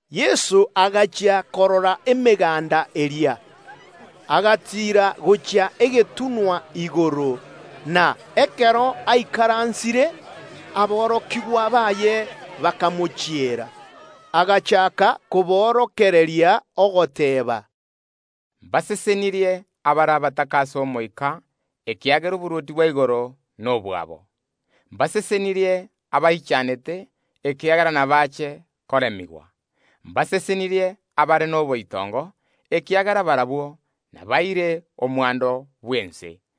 Yeso agachia korora emeganda eria y’abanto, agatiira gochia egetunwa igoro; na ekero aikaransire, aborokigwa baye bakamochiera. Agachaaka koborokereria, ogoteeba. Mbasesenirie abare abataka ase omoika, ekiagera oborwoti bwa igoro nobwabo. Mbasesenirie abaichanete, ekiagera inabaache koremigwa. Mbasesenirie abare noboitongo, ekiagera barabwo ’nabaire omwando bw’ense.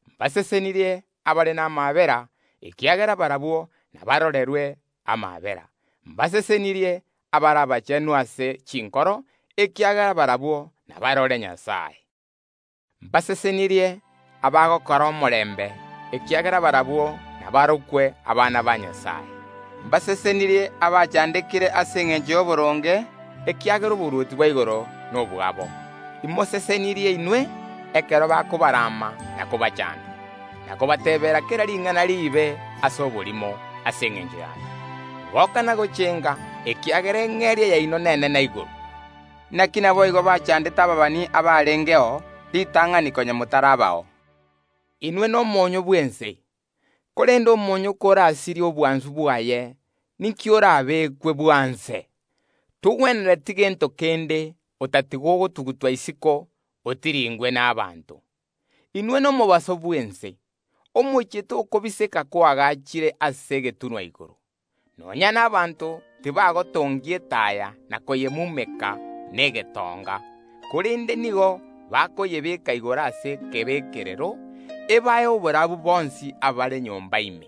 Mbasesenirie abakororera abande amaabera, ekiagera barabwo ’nabarorerwe amaabera. Mbasesenirie abare abachenu ase chinkoro, ekiagera barabwo ’nabarore Nyasae. Mbasesenirie abagokora omorembe, ekiagera barabwo ’nabarokwe abana ba Nyasae. Mbasesenirie abagochandwa ase engencho y’oboronge, ekiagera oborwoti bwa igoro nobwabo. Imosesenirie inwe, ekero abanto bakobarama na kobachaanda, na kobateebera kera ring’ana riibe ase oborimo, ase engencho y’ane. Goka na gochenga, ekiagera eng’eria yaino n’enene igoro. Inaki naboigo bachaandete ababani abarengeo ritang’ani konya motarabao. Inwe nomonyoo bw’ense; korende omoonyo korasirie obwansu bwaye, ninki orabekwe bwanse? Togwenereti gento kende otatiga ogotugutwa isiko, otirindachwe n’abanto. Inwe noborabu bw’ense. Omochie tokobiseka koagachire ase egetunwa igoro. Nonya n’abanto tibagotongia etaya na koyemumeka negetonga, korende nigo bakoyebeeka igoro ase egetangora, ebae oborabu bonsi abare nyomba ime.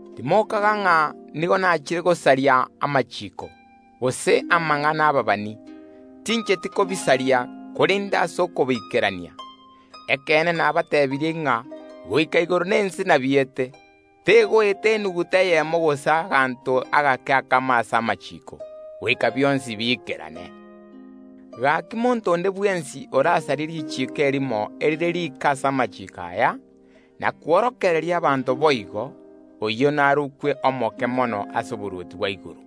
Timokaga ng’a nigo nachire gosaria amachiiko, gose amang’ana y’ababani; tincheti kobisaria, korende ase okobiikerania. Ekeene nabateebirie ng’a, goika igoro na ense biete, korende tegoeta enuguta eyemo gose agatone akamo ase amachiiko, goika bionsi biikerane. Ase igo monto onde bwensi orasarie richiiko erimo erire rike ase amachiiko aya, na kworokereria abanto kogosaria okwo, oyio narokwe omoke mono ase oborwoti bwa igoro,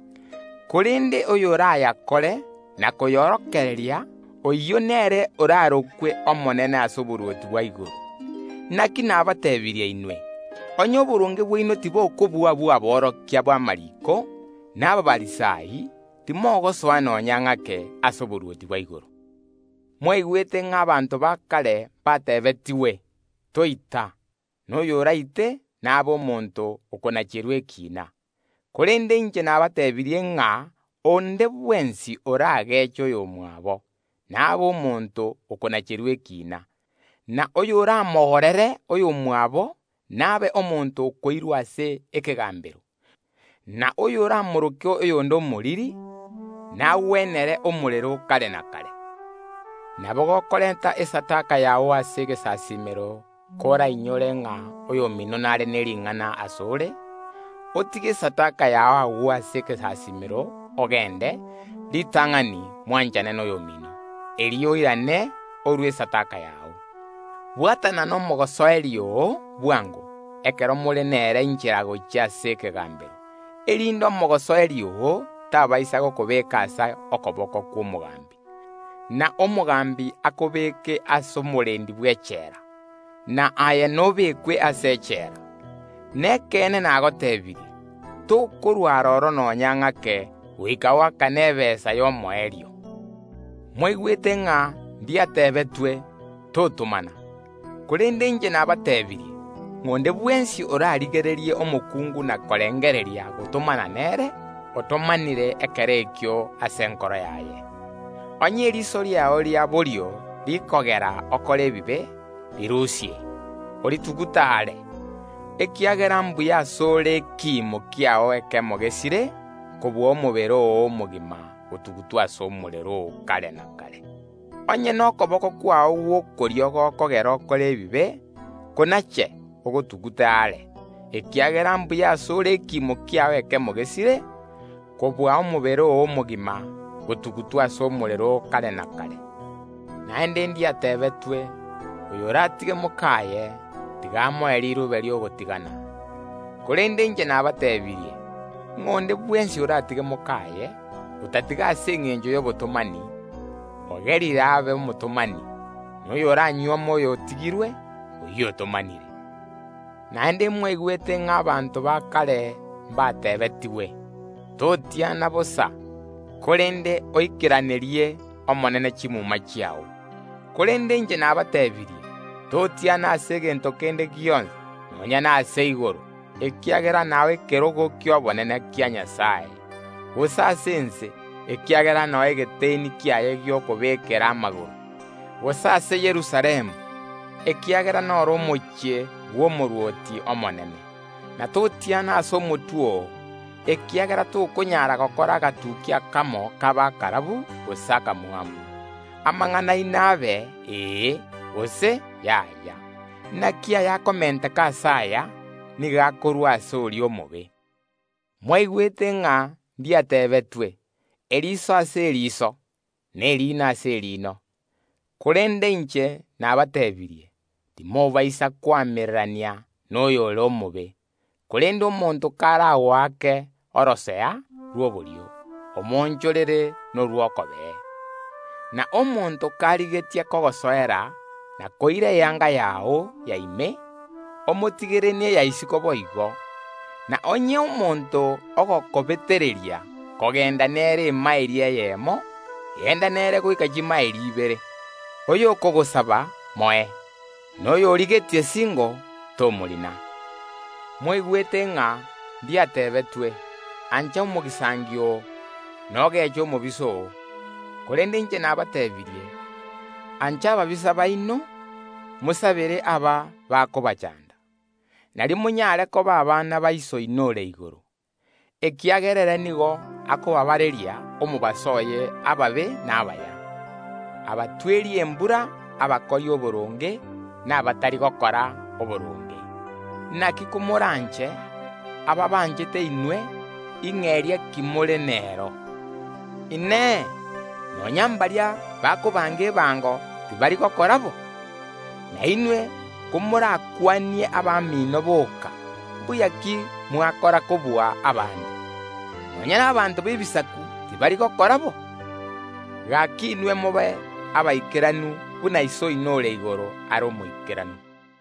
korende oyorayakore na koyorokereria, oyio nere orarokwe omonene ase oborwoti bwa igoro. Inaki nabateebirie inwe, onye oboronge bwaino tibokobua obw’aborokia b’amariiko na Abafarisai, timogosoa nonya ng’ake ase oborwoti bwa igoro. Mwaigwete ng’a abanto ba kare ’mbateebetigwe: Toita; na oyoraite nabe omonto okonacherwa ekiina. Korende inche nabateebirie ng’a onde bwensi orageeche oyomwabo, nabe omonto okonacherwa ekiina, na oyoramogorere oyomwabo nabe omonto okoirwa ase ekegaambero, na oyoramoroke oyonde Omoriri! Nagwenere omorero o kare na kare. Nabo gokorenta okorua kwao ase egesasiimero, korainyore ng’a oyomino nare ne ring’ana ase ore, otige okorwa kwao agwo ase egesasiimero, ogende ritang’ani mwanchane noyomino, erio oirane ase okorua kwao. Bwatana nomosoeri oo bwango, ekero more nere inchera gochia ase ekegaambero, erinde omosoeri oo tabaisa gokobeeka ase okoboko kw’omogaambi, na omogambi akobeke ase omorendi bw’echela, naye norutwe ime yechela. Nekeene nagoteebirie: Tokorwa aroro nonya ng’ake goika oakane ebesa y’omoerio. Mwaigwete ng’a ndiateebetwe: Totomana. Korende inche nabateebirie, ng’a onde bwensi orarigererie omokungu na korengereria gotomana nere otomanire nere ime ase enkoro yaye. Onye eriiso riao ria borio rikogera okore ebibe, rirusie, oritugute are, ekiagera mbuya ase ore ekiimo kiao ekemo gesire, kobua omobere oo omogima gotugutwa ase omorero o kare na kare. Onye nokoboko kwao gw’okorio gokogera okore ebibe, konache, ogotugute are, ekiagera mbuya ase ore ekiimo kiao ekemo gesire, kobua omobere oo omogima gotugutwa ase omorero o kare na kare. Naende ndiateebetwe; Oyoratige mok’aye, tiga amoe riruube ri’ogotigana. Korende inche nabateebirie, ng’a onde bwensi oratige mok’aye, otatiga ase engencho y’obotomani, ogerire abe omotomani; na oyoramonyuome oyotigirwe, oyio otomanire. Naende mwaigwete ng’a abanto ba kare mbateebetigwe: Totiana bosa, korende oikeranerie ase Omonene chiira chiao. Korende inche nabateebirie: Totiana ase egento kende gionsi; nonya nase igoro, ekiagera nao ekerogo ki’obonene kia Nyasae; gose ase ense, ekiagera nao ekerogo kiaye gi’okobekerera amagoro; gose ase Yerusalemu, ekiagera n’oro omochie bw’Omorwoti omonene. Na totiana ase omotwe oo, ekiagera tokonyara gokora agatukia akamo kabe akarabu gose akamwamu. Amang’ana aino abe: Ee, gose: Yaaya; naki ayakomenteka ase aya, nigo akorwa ase oria omobe. Mwaigwete ng’a ndiateebetwe: “Eriso ase eriiso, na erino ase erino.” Korende inche nabateebirie: Timobaisa koamererania noyore omobe. Korende omonto karagoake orosea rwa borio, omoonchorere norw’okobee. Na omonto karigetie gokoira ase ekegambero kogosoera na koira eyanga yao ya ime, omotigere neya isiko boigo. Na onye omonto ogokobetereria kogenda nere emaeli eyemo, genda nere goika chimaeli ibere. Oyokogosaba, moe; na oyorigetie singo, tomorina. Mwaigwete ng’a ndiateebetwe: “Ancha omogisangio oo, na ogeche omobisa oo.” Korende inche nabateebirie: Ancha ababisa baino, mobasabere abakobachanda, nario moranyare koba abana ba Iso oino ore igoro, ekiagera ere nigo akobabareria omobaso oye ababe na abaya, obatweria embura abakori oboronge, na abatari gokora oboronge. Inaki komoranche abaabanchete inwe, ing’eria ki more nero? Inee! Nonya mbaria bakorusia ebango tibari gokora bo? Na inwe komorakwanie abamino boka, mbuya ki mwakora kobua abande? Nonya n’abanto b’Ebisaku tibari gokora boigo? Gaki inwe mobe abaikeranu buna Iso oino ore igoro are omoikeranu.